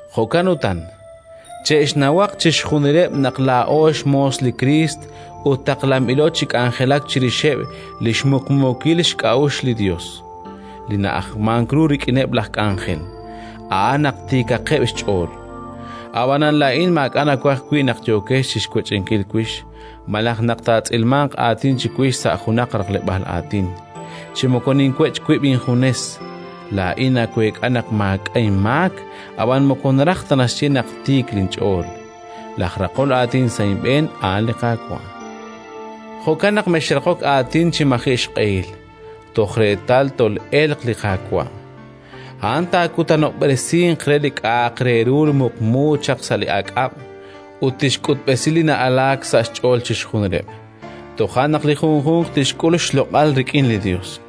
Jo'kan utan, che'xnawaq chixjunileb' naq laa'o xmoos li Kriist ut taqlanb'ilo chi k'anjelak chirixeb' li xmuqmuukil k'a'uxl li Yos. Li na'ajmank ru rik'ineb' laj k'anjel, a'an naq tiikaqeb' xch'ool. Ab'anan laa'in maak'a' nawaj wi' naq yooqex chi xwech'inkil wix, malaj naq taatz'ilmanq aatin chiwix sa' junaq raqleb'aal aatin. Chi moko ninwech' wib' injunes! Laa'in naweek'a naq maak'a' inmaak, ab'anan moko naraj ta naxye naq tiik linch'ool. Laj raqol aatin sa' inb'een a'an li Qaawa'. Jo'kan naq mexraqok aatin chi maji' xq'ehil, toj reetal tol'elq li Qaawa'. A'an taakutanob'resinq re li k'a'aq re ru muqmu chaq sa' li aak'ab' ut tixk'utb'esi li na'alaak sa' xch'ool chixjunileb'. Toja' naq li junjunq tixk'ul xloq'al rik'in li Yos.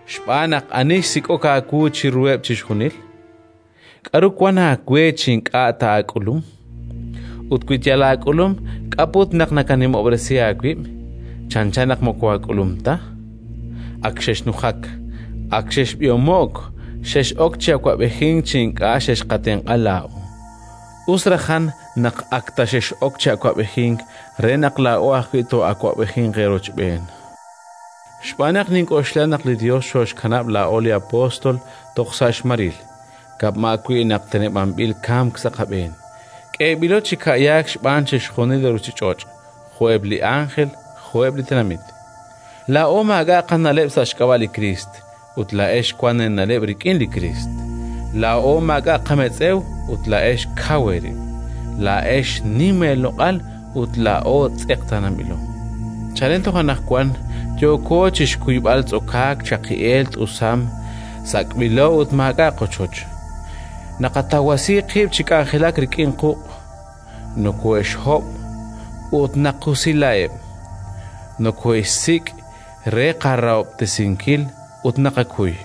xb'aan naq ani xsik'ok aawu chiruheb' chixjunil? K'aru wank aawe chi ink'a' ta aak'ulum? Ut wi yal aak'ulum, k'a' put naq nakanimob'resi aawib' chanchan naq moko aak'ulum ta? Ak xexnujak! Ak xexb'ihomo'k! Xex'ok chi awab'ejink chi ink'a' xexqatenq'a laa'o! Us rajan naq ak ta xex'ok chi awab'ejink re naq laa'o ajwi' too'awab'ejinq eerochb'een! Xb'aan naq nink'oxla naq li Yos xooxkanab' laa'o li apóstol toj sa' xmaril, kama' wi' naq teneb'anb'il kamk sa' qab'een; k'eeb'ilo chi ka'yaak xb'aan chixjunil li ruuchich'och', jo'eb' li ánjel jo'eb' li tenamit. Laa'o maak'a' qana'leb' sa' xk'ab'a' li Kriist, ut laa'ex wank eena'leb' rik'in li Kriist. Laa'o maak'a' qametz'ew, ut laa'ex kaw eerib'. Laa'ex nim eeloq'al, ut laa'o tz'eqtaananb'ilo. Chalen toj anaqwan yooko chi xkuyb'al tz'okaak, chaqi'eel, t'usam; sak'b'ilo ut maak'a' qochoch. Naqatawasi qib' chi k'anjelak rik'in quq'. Nokoohe'xhob', ut naqusilaheb'. Nokoohe'xsik' re qarahob'tesinkil, ut naqakuy.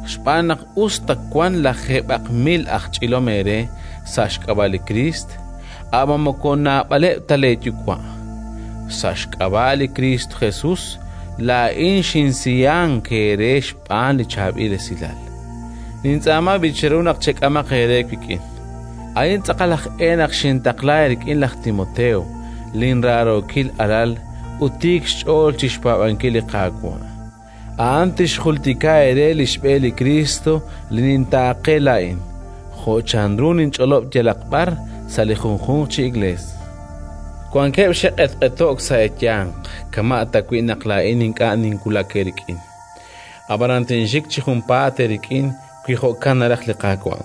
Xb'aan naq us ta wanq lajeeb'aq mil aj ch'ilom eere sa' xk'ab'a' li Kriist, ab'an moko naab'aleb' ta leeyuwa'. Sa' xk'ab'a' li Kristo Jesus laa'in xinsiyank eere xb'aan li Chaab'il Esilal. Nintz'aama b'i' cheru naq chek'amaq eere wik'in. A'in tz'aqal aj e naq xintaqla eerik'in laj Timoteo, linraarookil alal ut tiik xch'ool chi xpaab'ankil li Qaawa'. A'an tixjultika eere li xb'e li Kriist li nintaaqe laa'in, jo' chanru ninch'olob' yalaq b'ar, sa' li junjunq chi Iklees. Wankeb' xe'q'etq'eto'k sa' eeyanq kama' tawi' naq laa'in ink'a' tinwulaq eerik'in. Ab'anan tinxik chi junpaat eerik'in, wi jo'kan naraj li Qaawa'.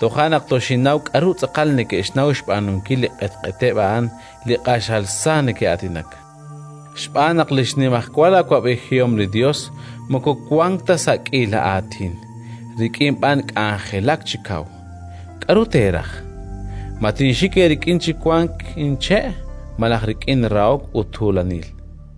Toja' naq toxinnaw k'aru tz'aqal neke'xnaw xb'aanunkil li q'etq'eteb' a'an li q'axal sa neke'aatinak. Xb'aan naq li xnimajwal awab'ejihom li Yos moko wank ta sa' k'iila aatin, rik'in b'an k'anjelak chi kaw. K'aru teeraj? Ma tinxik eerik'in chi wanq inche', malaj rik'in rahok ut tuulanil?